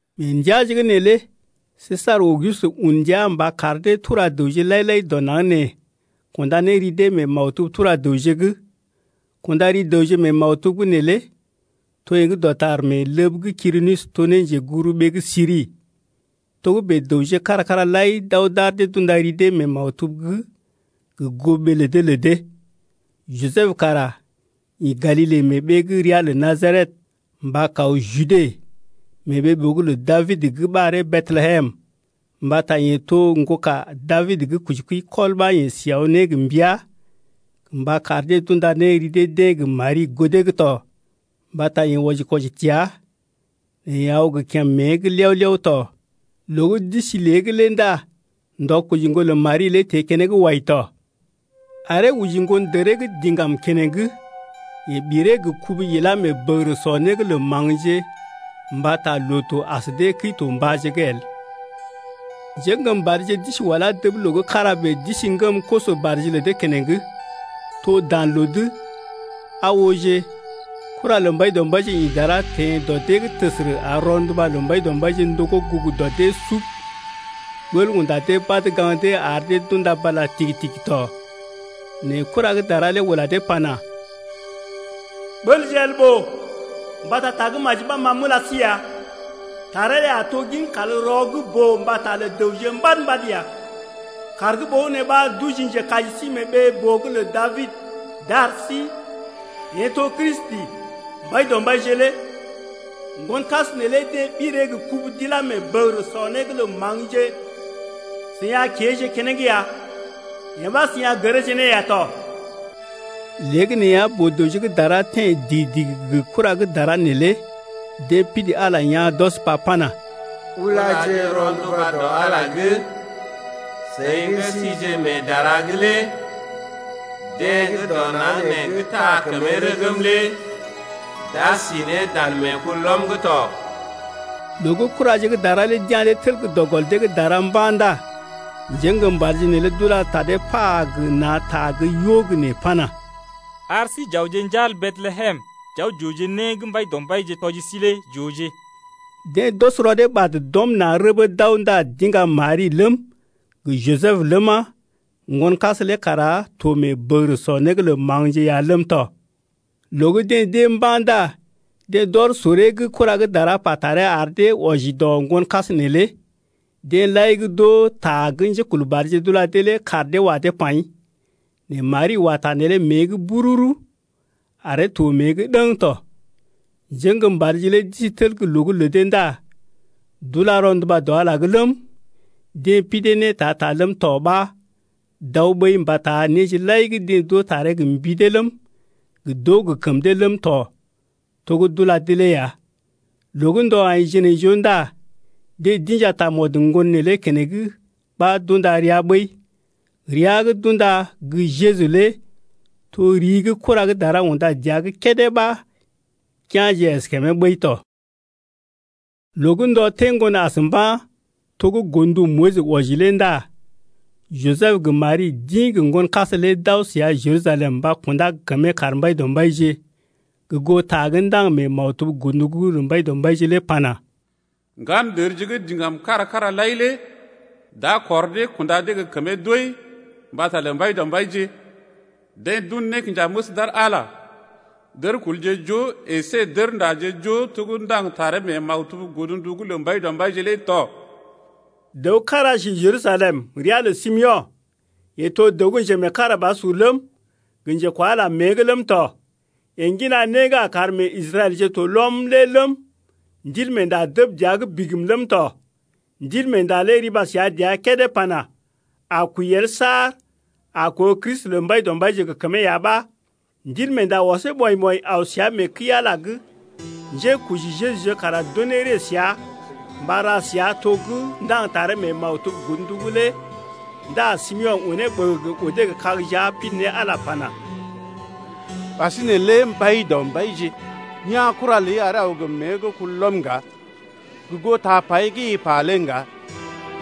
Mee ndəaje’g neelé Sesar Auguste un ndia mba kar dee tura dəwje lai-lai dɔ naŋg nee kunda ne ri dee mee maktub-tura-dəwje’g. Kunda ri dəwje mee maktub’g neelé to yee gə́ dɔtar mee ləb gə́ Kirinius to ne njeguburuɓee gə́ Siri. Togə́bè dəwje kára-kára lai d’aw d’ar dee d’unda ri dee mee maktub’g gə goo ɓee lə dee lə dee. Jisəb kara ḭ Galile mee ɓee gə́ ria lə Najaret mba kaw Jude mee ɓee-boo’g lə Dabid gə́ ɓaree Betlehem, mbata yeḛ to ŋgoka Dabid gə́ koji kəi kɔl ɓa yeḛ si aw ne gə mbəa gə mba kar dee d’unda ne ri dee-deḛ gə Mari goo dee’g tɔ, mbata yeḛ wɔji-kwɔji təa nɛ yeḛ aw gə kèm mée’g liew-liew tɔ. Loo gə́ d’isi lée’g ndá ndɔ koji ŋgon lə Mari lé teḛ keneŋ wai tɔ, aree oji ŋgondəree gə́ diŋgam keneŋ. Yeḛ ɓiree gə kubu ilá mee bəgərə sɔ né’g lə maŋgje mbata loo-to as dee Kəi-to-mbàje’g el. Njéŋgəmbadje d’isi wala dəb loo gə́ kára bèe d’isi ŋgəm koso-badje lə dee keneŋ, to dan loo’g. Aa ooje kura lə Mbaidɔmbaije ḭ dara teḛ dɔ dee’g təsərə ar rɔnduba lə Mbaidɔmbaije ndogó gugu dɔ dee sub. Ɓəl unda dee badə gaŋg dee ar dee d’unda bala tigi-tigi tɔ. Nɛ kura gə́ dara lé ula dee pana: Ɓəlje el ɓòo! Mbata ta gə́ maji ɓa ma m’ula sí ya, taree lé a to gin kalrɔ gə́ boo mbata lə dəwje mbad-mbad ya. Kàr gə́ ɓogənè ɓa d’oji njekaji sí mee ɓee-boo’g lə Dabid d’ar sí, yeḛ to Kristi, Mbaidɔmbaije lé. Ŋgonkas neelé deḛ ɓiree gə kubu d’ilá mee bəgərə sɔ né’g lə maŋgje, seḭ a kéeje keneŋ ya, yee ɓa seḭ a gəreeje ne ya tɔ. Léegəneeya boo-dəwje gə́ dara teḛ digi-digi gə kura gə́ dara neelé. Deḛ pidi Ala lé yaa̰ d’ɔs ne pa pana: Ulaje rɔnduba dɔ Ala’g lé, seḭ gə́ síje mee dara’g lé Deḛ gə́ dɔ naŋg nee gə́ taa kəmee rəgm lé d’a sí ne dan meekulɔm’g tɔ. Loo gə́ kuraje gə́ dara lé d’ya̰ dee tel gə́ dɔ gɔl dee’g dara mba̰ ndá njéŋgəmbadje neelé d’ula ta dee pa gə na̰ ta gə́ yo gə́ nee pana: Ar sí j’awje njal Betlehem j’aw j’ooje né gə́ Mbaidɔmbaije tɔji sí lé j’ooje. Deḛ d’ɔs rɔ dee ɓad d’ɔm na̰ rəbee d’aw ndá d’iŋga Mari ləm, gə Jisəb ləma, ŋgonkas lé kara to mee bəgərə sɔ né’g lə maŋgje’g ya ləm tɔ. Loo gə́ deḛ d’ée mba̰ ndá deḛ d’ɔr soree gə́ kura gə́ dara pa taree ar dee wɔji dɔ ŋgonkas neelé. Deḛ lai gə́ d’oo ta gə́ njékulbadje d’ula dee lé kaar dee wa dee paḭ. Nɛ Mari wa ta neelé mée’g bururu, aree to mée’g ɗəŋ tɔ. Njéŋgəmbadje lé d’isi tel gə́ loo’g lə dee ndá d’ula rɔnduba dɔ Ala’g ləm, deḛ pidee ne ta-ta ləm tɔ, ɓa d’aw ɓəi mbata néje lai gə́ deḛ d’oo taree gə mbi dee ləm, gə d’oo gə kəm dee ləm tɔ, to gə́ d’ula dee lé ya. Loo gə́ ndɔ aḭ jinaijoo ndá deḛ d’inja tamɔd ŋgon neelé keneŋ ɓa d’unda ria ɓəi, ria gə́ d’unda gə́ Jeju lé to ri gə́ kura gə́ dara unda dəa’g kédé ɓa kea̰je əskèmee ɓəi tɔ. Loo gə́ ndɔ teḛ ŋgon as mba̰, to gə́ godndu Moyis wɔji lé ndá Jisəb gə Mari d’ḭ gə ŋgonkas lé d’aw səa Jerusalem mba kundá gə kəmee kar Mbaidɔmbaije 3gə goo ta gə́ ndaŋg mee maktub godndu’g lə Mbaidɔmbaije lé pana: Ŋgandərje gə́ diŋgam kára-kára lai lé d’a kɔr dee kunda dee gə kəmee doi mbata lə Mbaidɔmbaije. Deḛ d’un nékinjaməs d’ar Ala, dərkulje joo əsé dərndaje joo to gə́ ndaŋg taree mee maktub godndu’g lə Mbaidɔmbaije lé tɔ, Dəw kára si Jerusalem ria lə Simeo̰. Yeḛ to dəw gə́ njemeekarabasur ləm, gə njekwa Ala lé mée’g ləm tɔ. Yeḛ ŋgina né gə́ a kar meḛ Israɛlje to lɔm lé ləm, Ndilmeenda dəb dəa’g bigim ləm tɔ. Ndilmeenda lé riba səa dəa kédé pana: A kwəi el saar a koo Kristi lə Mbaidɔmbaije gə kəmee ya ɓa. Ndilmeenda ɔsee ɓɔḭ-ɓɔḭ aw səa mee kəi-Ala’g. Njékoji Jejuje kara d’unee ree səa mba ra səa to gə́ ndaŋg ne taree mee maktub godndu’g lé ndá Simeo̰ unee ɓəgəgə odee gə kag jia pidi ne Ala lé pana: Ɓasinè lé Mbaidɔmbaije, ya̰ kura ləi Aree aw gə mée gə́ kulɔm ŋga, gə goo tapai gə́ i pa lé ŋga.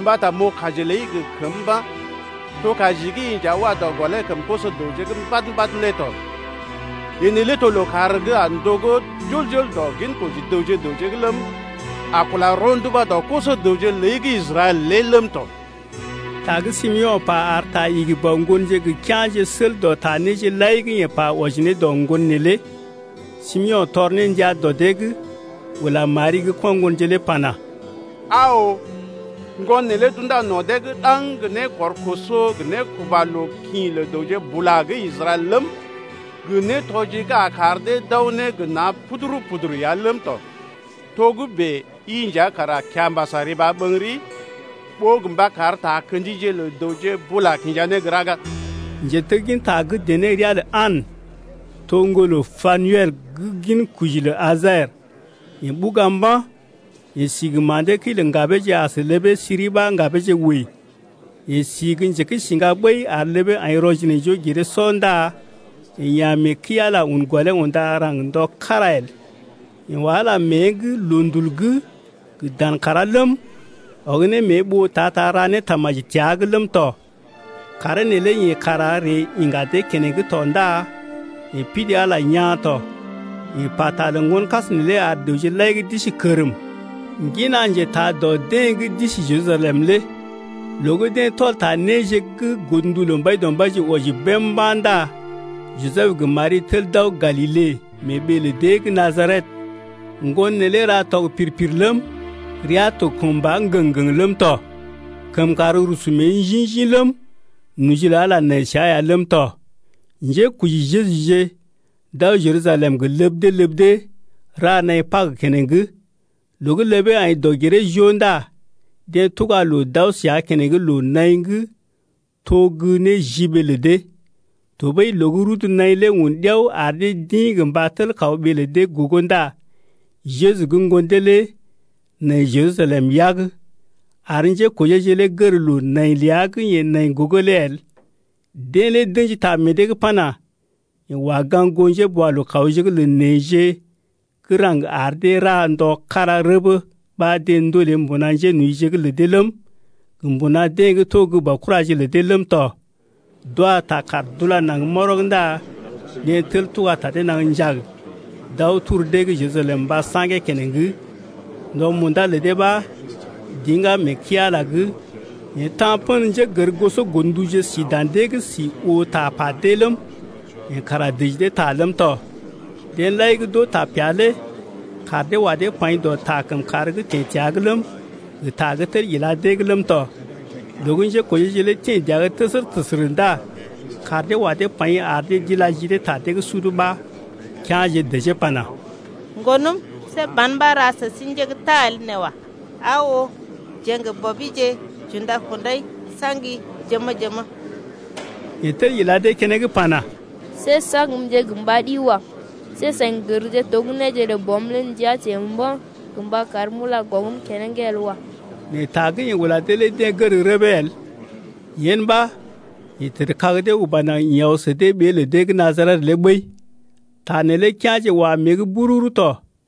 Mbata m’oo kaji ləi gə kəm mba̰ To kaji gə́ i nja wa dɔ gɔlee kəm koso-dəwje mbad-mbad lé tɔ. Yee neelé to lookàr gə́ a ndogó jol-jol dɔ ginkoji dəwje gə raŋg’g ləm, A kula rɔnduba dɔ koso-dəwje ləi gə́ Israɛl lé ləm tɔ. Ta gə́ Simeo̰ pa ar ta igi bɔ ŋgonje gə kea̰je sel dɔ ta néje lai gə́ yeḛ pa wɔji ne dɔ ŋgon neelé. Simeo̰ tɔr ne ndia dɔ dee’g, ula Mari gə́ ko̰ ŋgonje lé pana: Aa oo, ŋgon neelé d’unda no̰ dee’g ɗaŋg gə né kɔr koso gə nékuba loo kḭ lə dəwje bula gə́ Israɛl ləm, gə nétɔji gə́ a kar dee d’aw ne gə na̰ puduru-puduru ya ləm tɔ. Togə́bè i nja kara kiambas a riba ɓəŋgəri ɓó gə mba kar takə̰jije lə dəwje bula kinja ne gə́ raga. Njetegginta gə́ dené ria lə An, to ŋgolə Panuel gə́ ginkoji lə Aser. Yeḛ ɓuga mba̰. Yeḛ si gə ma̰dee kəi lə ŋgabeeje as ləbee siri ɓa ŋgabeeje wəi. Yeḛ si gə́ njekəisiŋga ɓəi ar ləbee aḭ rɔ-jinaijoo-giree-sɔ ndá yeḛ ya̰ mee kəi-Ala un gɔlee unda raŋg ndɔ kára el. Yeḛ wa Ala mée’g loondul’g gə dan kàrá ləm, ɔg ne mée ɓoo ta-ta ra ne tamaji təa’g ləm tɔ. Kàree neelé yeḛ kara ree iŋga dee keneŋ tɔ ndá yeḛ pidi Ala lé yaa̰ tɔ. Yeḛ pata lə ŋgonkas neelé ar dəwje lai gə́ d’isi kərm ŋgina njetaa dɔ dee gə́ si Jerusalem lé. Loo gə́ deḛ tɔl ta néje gə́ godndu lə Mbaidɔmbaije wɔji bém mba̰ ndá Jisəb gə Mari tel d’aw Galile mee ɓee lə deḛ gə́ Najaret. Ŋgon neelé ra tɔg pir-pir ləm, rəa to kəmba ŋgəŋ-ŋgəŋ ləm tɔ. Kəmkàr rusu mée njḭ-njḭ ləm, noji lə Ala nai səa ya ləm tɔ. Njékoji Jejuje d’aw Jerusalem gə ləb dee ləb dee ra naḭ Pag keneŋ. Loo gə́ ləbee aḭ dɔg-giree-joo ndá deḛ tuga loo d’aw səa keneŋ loo-naḭ’g to gə́ néjiɓee lə dee. Tɔɓəi loo gə́ rudu naḭ lé un ɗiao ar dee d’ḭ gə mba tel kaw ɓee lə dee gogo ndá Jeju gə́ ŋgon dee lé nai Jerusalem yag, ar njékojeeje lé gər loo nai ləa gə́ yeḛ nai gogo lé el. Deḛ lé d’ə̰ji ta meḛ dee’g pana: Yeḛ wa gaŋg goo njéboalookawje’g lə neḛje gə́ raŋg ar dee ra ndɔ kára rəbə ɓa deḛ ndolee mbuna njénojije’g lə dee ləm, gə mbuna deḛ gə́ to gə́ baokuraje’g lə dee ləm tɔ. D’wa ta kàr d’ula naŋg mɔrɔg ndá deḛ tel tuga ta dee naŋg njag d’aw tor dee’g Jerusalem mba saŋgee keneŋ. Ndɔ munda lə dee ɓa d’iŋgá mee kəi-Ala’g, yeḛ ta̰ pə̰ njégərgosɔ godnduje si dan dee’g si oo tapa dee ləm, yeḛ kara dəji dee ta ləm tɔ. Deḛ lai gə́ d’oo tapea lé kaar dee wa dee paḭ dɔ ta kəmkàr gə́ teḛ təa’g ləm, gə ta gə́ tel ila’g ləm tɔ. Loo gə́ njékojeeje lé teḛ dəa’g təsərə-təsərə ndá kaar dee wa dee paḭ ar dee d’ila ji dee ta dee’g sud ɓa, kea̰je dəjee pana: Ŋgonəm, see ban ɓa ra sə sí nje gə́ tal nee wa. Aa oo, jeḛ gə bɔbije j’unda-kundai n’sa̰gi jəmə-jəmə. Yeḛ tel ila dee keneŋ pana: See saŋgmje gə mba ɗi wa. See seḭ gərje to gə́ néje lə Bɔm lé ndəa teḛ mba̰ gə mba karm m’ula gɔŋgm keneŋ el wa. Nɛ ta gə́ yeḛ ula dee lé deḛ gər rəbee el. Yen ɓa, yeḛ tədkag dee uba naŋg ḭ aw sə dee ɓee lə dee gə́ Najaret lé ɓəi. Ta neelé kea̰je wa mée’g bururu tɔ.